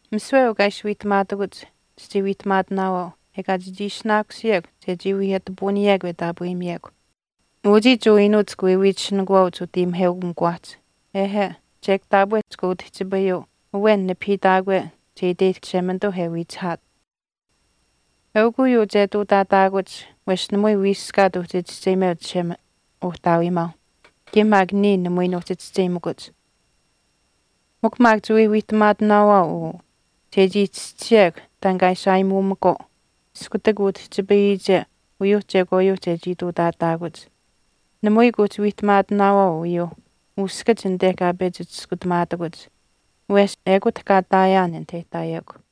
“Misiwe uu kaa ishi wiihtamaatakuch chichii wiihtamaatinaawaau ekaa chechii ishinaakusiyekw chechii wii ati puuniyekw e taapweyimiyekw. Uchii Jewa iinuuch chika wiiwiitisinikuwaauch utayimiheukamikuwaahch. Ehe, chek taapwe chika utihchipayuu awen nipahiitaakwe che iteyihtahk Chishemanituu e wiichihaat. Eukw uyuu che ihtuutaataakuch wesh namui wiiskaat uhchi chischeyimeuch Uhtaawiimaau kaye maak niya namui nuuhchi chischeyimakuch. Mikw maak chiwii wiihtamaatinaawaau uu chechii chischisiyekw taan kaa ishi aayimuumakwaau iskutak utihchipayiyiche uyuuh chekwaayuuh chechii ihtuutaataakuch. Namui kuuhchi wiihtamaatinaawaau uyuu uskach anite kaa pechi chiskutamaatakuch wesh ekut kaa ihtaayaan anit e ihtaayekw.”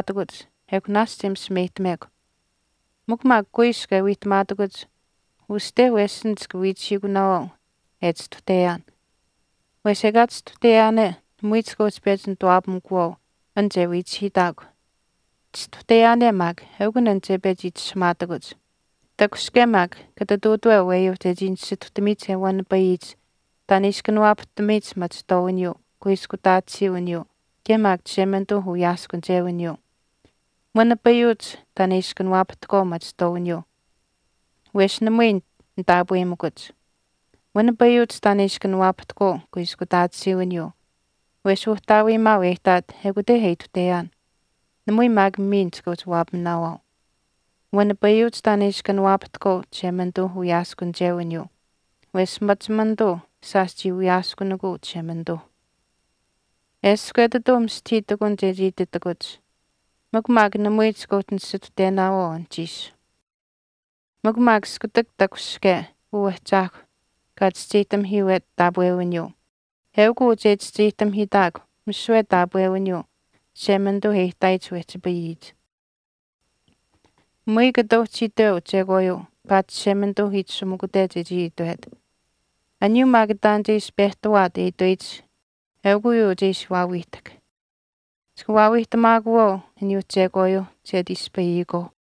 Anuhchiish maak e chii wiihtamaatakuch ekw naashch e misimeyihtamekw. Mikw maak kuiskw e wiihtamaatakuch uste wesin chika wiichihiikunaawaau e chistuhteyaan, wesh ekaa chistuhteyaane namui chika uhchi pechi nituwaapamikuwaau an che wiichihiitaakw, chistuhteyaane maak eukun an che pechi itishahamaatakuch. Takushihke maak kata ihtuutaweu aweyuu chechii nisituhtamiyich e wanipayiyich taan e ishi kanawaapahtamiyich machihtwaawiniyuu, kuiskutaatisiiwiniyuu kaye maak Chishemanituuh uwiyaaskunichewiniyuu. Wanipayuuch taan e ishi kanawaapahtahkwaau machihtwaawiniyuu wesh namui nitaapweyimikuch. Wanipayuuch taan e ishi kanawaapahtahkwaau kuiskutaatisiiwiniyuu, wesh Uhtaawiimaau e ihtaat ekute e ituhteyaan, namui maak miin chika uhchi waapaminaawaau. Wanipayuuch taan e ishi kanawaapahtahkwaau Chishemanituu uwiyaaskunichewiniyuu wesh machimanituu shaash chii wiyaaskunikuu Chishemanituuh.” “Eshkw etituu mistahii ihtakun chechii ititakuch mikw maak namui chika uhchi nisituhtenaawaau anuhchiish. Mikw maak iskutak takushihke uu Ahchaahkw kaa chischeyihtamihiiwet taapwewiniyuu eukuu che chischeyihtamihiitaakw misiwe taapwewiniyuu Chishemanituu e ihtaayich wehchipayiyich. Namui kata uhchi itweu chekwaayuu paatish Chishemanituu itashumikute chechii itwet. Aniyuu maak taan che ishi pehtawaat e itweyich eukw uyuu che ishi waawiihtahk. Chika waawiihtamaakuwaau aniyuuh chekwaayuuh che ati ispayiyikwaau.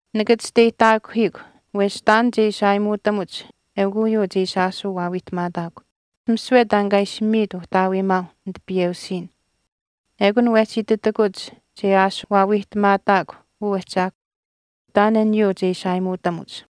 Nika chisteyihtaakuhiikw wesh taan che ishi aayimuutamuch eukw uyuu che ishi aashuu waawiihtamaataakw. Misiwe taan kaa ishi miit Uhtaawiimaau nitipiyeusiin. Ekun wehchi ititakuch che aashuu waawiihtamaataakw uu Ahchaahkw taan aniyuuh che ishi aayimuutamuch.”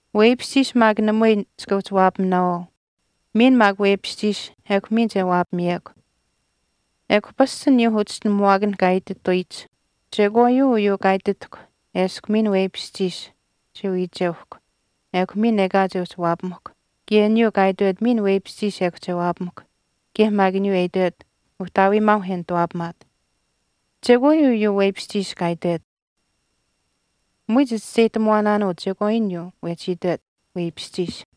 “Weipishchiish maak namui chika uhchi waapaminaawaau. Miin maak weipishchiish ekw miin che waapamiyekw.” Ekw pasch aniyuuh uchischinuhamuwaakan kaa itituyich, “Chekwaayuu uyuu kaa ititahkw eshkw miin weipishchiish che wiicheuhkw ekw miin ekaa che uhchi waapamahkw kaye aniyuu kaa itwet miin weipishchiish ekw che waapamahkw, kaye maak aniyuu e itwet, ‘Uhtaawiimaau e nituwaapamaat.’ Chekwaayuu uyuu weipishchiish kaa itwet. Namui chichischeyihtamuwaanaanuu chekwaayuu aniyuu wehchi itwet, ‘Weipishchiish.’”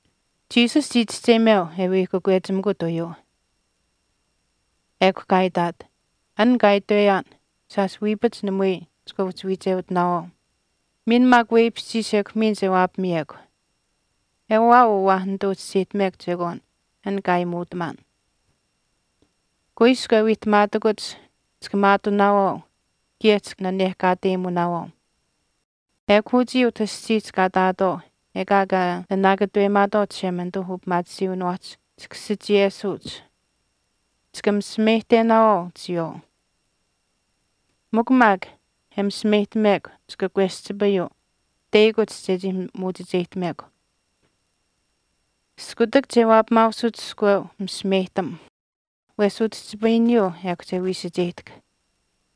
Jesus chii chischeyimeu e wii kakwechimikut uyuu. Ekw kaa itaat, “An kaa itweyaan, shaash wiipach namui chika uhchi wiicheutinaawaau. Miin maak weipishchiish ekw miin che waapamiyekw. Ewaa uu waa nituu chischeyihtamekw chekwaan an kaa aayimuutamaan. Kuiskw e wiihtamaatakuch chika maatunaawaau kaye chika nanehkateumunaawaau. Ekw uchii utah aschiihch kaa ihtaatwaau ekaa kaa nanaakatuweyimaatwaau Chishemanituuh upimaatisiiwiniwaahch chika sichiyesuuch. Chika misimeyihtenaawaau chiyawaau. Mikw maak an e misimeyihtamekw chika kweschipayuu teyakuch chechii muuchicheyihtamekw. Iskutak che waapamaausut iskweu misimeyihtam wesh utihchipayiniyuu ekw che wiisacheyihtahk.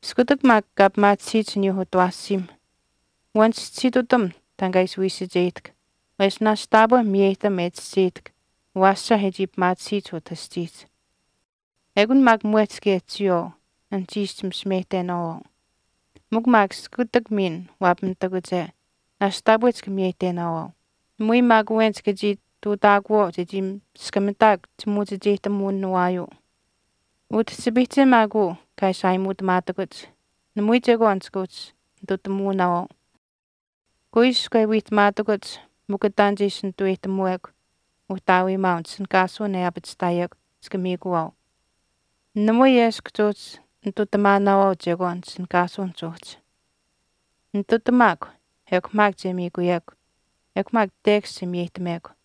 Iskutak maak kaa pimaatisiyich aniyuu utawaashiim wanichischisiitutam taan kaa ishi wiisacheyihtahk wesh naashch taapwe miyeyihtam e chischeyihtahk awaasha e chii pimaatisiyich utah aschiihch. Ekun maak mwehch kaye chiyawaau, anuhchiish chimisimeyihtenaawaau. Mikw maak iskutak miin waapamitakuche naashch taapwe chika miyeyihtenaawaau. Namui maak awen chika uhchii ihtuutaakuwaau chechii miskamitaakw chimuuchicheyihtamuwinawaayuu.” “Utihchipayihche maak uu kaa ishi aayimuutamaatakuch namui chekwaan chika uhchi nitutamuunaawaau. Kuiskw e wiihtamaatakuch mikw taan che ishi nituweyihtamuwekw Uhtaawiimaau nitishinihkaasuwin e aapachihtaayekw chika miikuwaau. Namui eshkw chuuhchi nitutamaanaawaau chekwaan nitishinihkaasuwinihch uhchi. Nitutamaakw ekw maak che miikuyekw, ekw maak tekash che miyeyihtamekw.”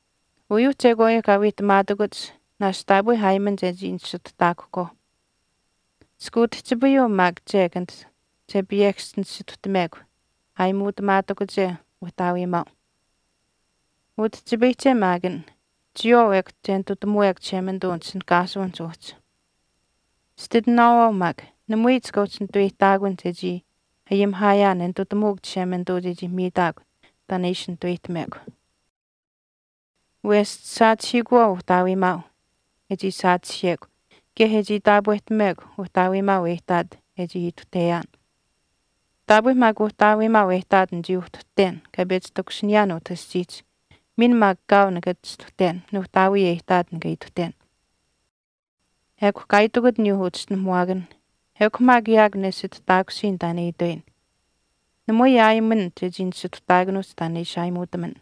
“Uyuu chekwaayuuh kaa wiihtamaatakuch naashch taapwe aayiman chechii nisituhtaakuhkwaau. Chika utihchipayuu maak chek anit che piyekasch nisituhtamekw aayimuutamaatakuche Uhtaawiimaau. Utihchipayihche maak an, chiyawaau ekw che nitutamuwekw Chishemanituu nitishinihkaasuwinihch uhchi. Chititinaawaau maak, namui chika uhchi nituweyihtaakun chechii ayimihaayaan e nitutamuuk Chishemanituu chechii miitaakw taan e ishi nitaweyihtamekw. Wesh chisaachihiikuwaau Uhtaawiimaau e chii saachihiyekw kaye e chii taapwehtamekw uhtaawiimaau e ihtaat e chii uhtuhteyaan. Taapwe maak Uhtaawiimaau e ihtaat nichii uhtuhten kaa pechi takushiniyaan utah aschiihch miin maak kaau nikaa chistuhten Nuuhtaawii e ihtaat nikaa ituhten.” Ekw kaa itikut aniyuu uchischinuhamuwaakanh, “Ekw maak yaakw nesituhtaakusiyin taan e itweyin. Namui aayiman chechii nisituhtaakuhch taan e ishi aayimuutaman.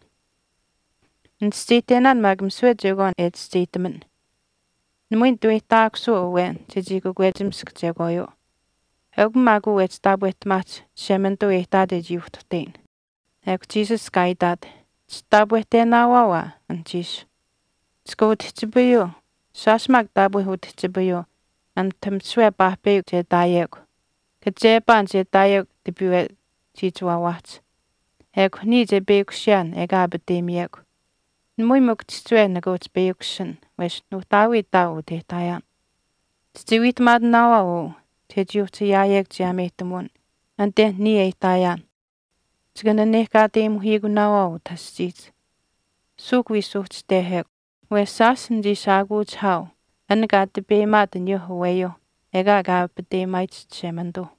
Nichischeyihtenaan maak misiwe chekwaan e chischeyihtaman, namui nituweyihtaakusuu awen chechii kakwechimisk chekwaayuu, eukw maak uu wehchi taapwehtamaahch Chishemanituu e ihtaat e chii uhtuhteyin.” Ekw Jesus kaa itaat, “Chitaapwehtenaawaau aa anuhchiish. Chikaa utihchipayuu, shaash maak taapwe utihchipayuu anit misiwe paahpeyakw che ihtaayekw, kachepaan che ihtaayekw tipiiwe chiichiwaawaahch. Ekw niya che peyakushiyaan ekaa aapateyimiyekw. Namui mikw chihchiwe nika uhchi peyakushin wesh Nuuhtaawii ihtaau utah e ihtaayaan. Chichii wiihtamaatinaawaau uu chechii uhchi ayaayekw chiyaameyihtamuwin anite niya e ihtaayaan. Chikaa nanekaateyimuhiikunaawaau utah aschiihch. Suuhk wii suuhchitehekw, wesh shaash nichii shaakuuchihaau an kaa tipeyimaat aniyuu aweyuu ekaa kaa aapateyimaayich Chishemanituu.”